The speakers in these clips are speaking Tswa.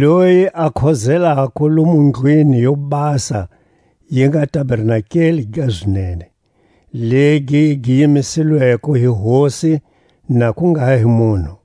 loyi a khozelako lomu ndlwini yo basa yi nga tabernakeli ga zinene, legi gi yimisilweko hi Hosi, na ku nga hi munhu.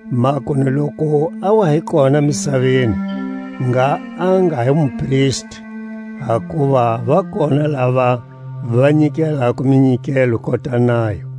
Makunu loku a wa hi kona misaveni ngha a nga hi mupristi, hakuva va kona lava va nyikelako minyikelo kota nayo;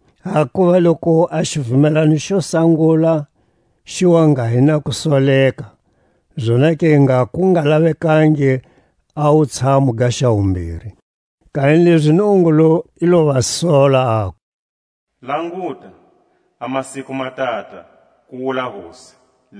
Hakuva loku a xivumelwano xe sangula xi wa nga hi na kusoleka, zonake ngha ku nga lavekangi a wutshamu ga xa wumbiri. Kanilezi Nungungulu i lo va sola, aku: Languta, a masiku ma tata, ku wula Hosi,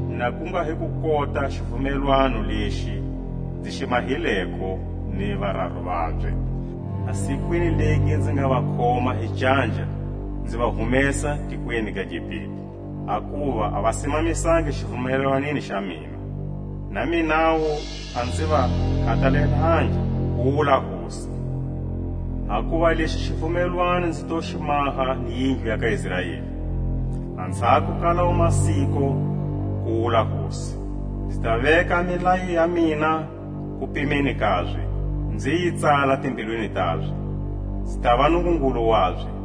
Na ku nga hi ku kota a xivumelwano lexi nzi xi mahileko ni vararu vabye, A sikwini legi nzi nga va khoma hi canja nzi va humesa a tikweni ga Gipite; Hakuva a va simamisangi xivumelwaneni xa mina, Na minawu a nzi va khatalelangi, ku wula Hosi. Hakuva lexi hi xivumelwano nzi to xi maha ni yindlu ya ka Israeli Anzhako ka lawo masiku, ku wula Hosi: Nzi ta veka milayo ya mina kupimeni kabye, Nzi yi tsala timbilwini tabye; Nzi tava Nungungulu wabye,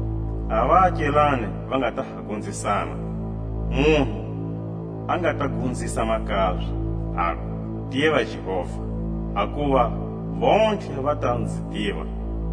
A vaakelani va nga ta ha gonzisana, Munhu a nga ta gonzisa makabye, aku: Tiva Jehova! Hakuva vontlhe va ta nzi tiva,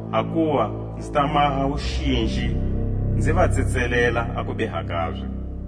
Hakuva nzi ta maha wuxinji nzi va tsetselela a kubiha kabye,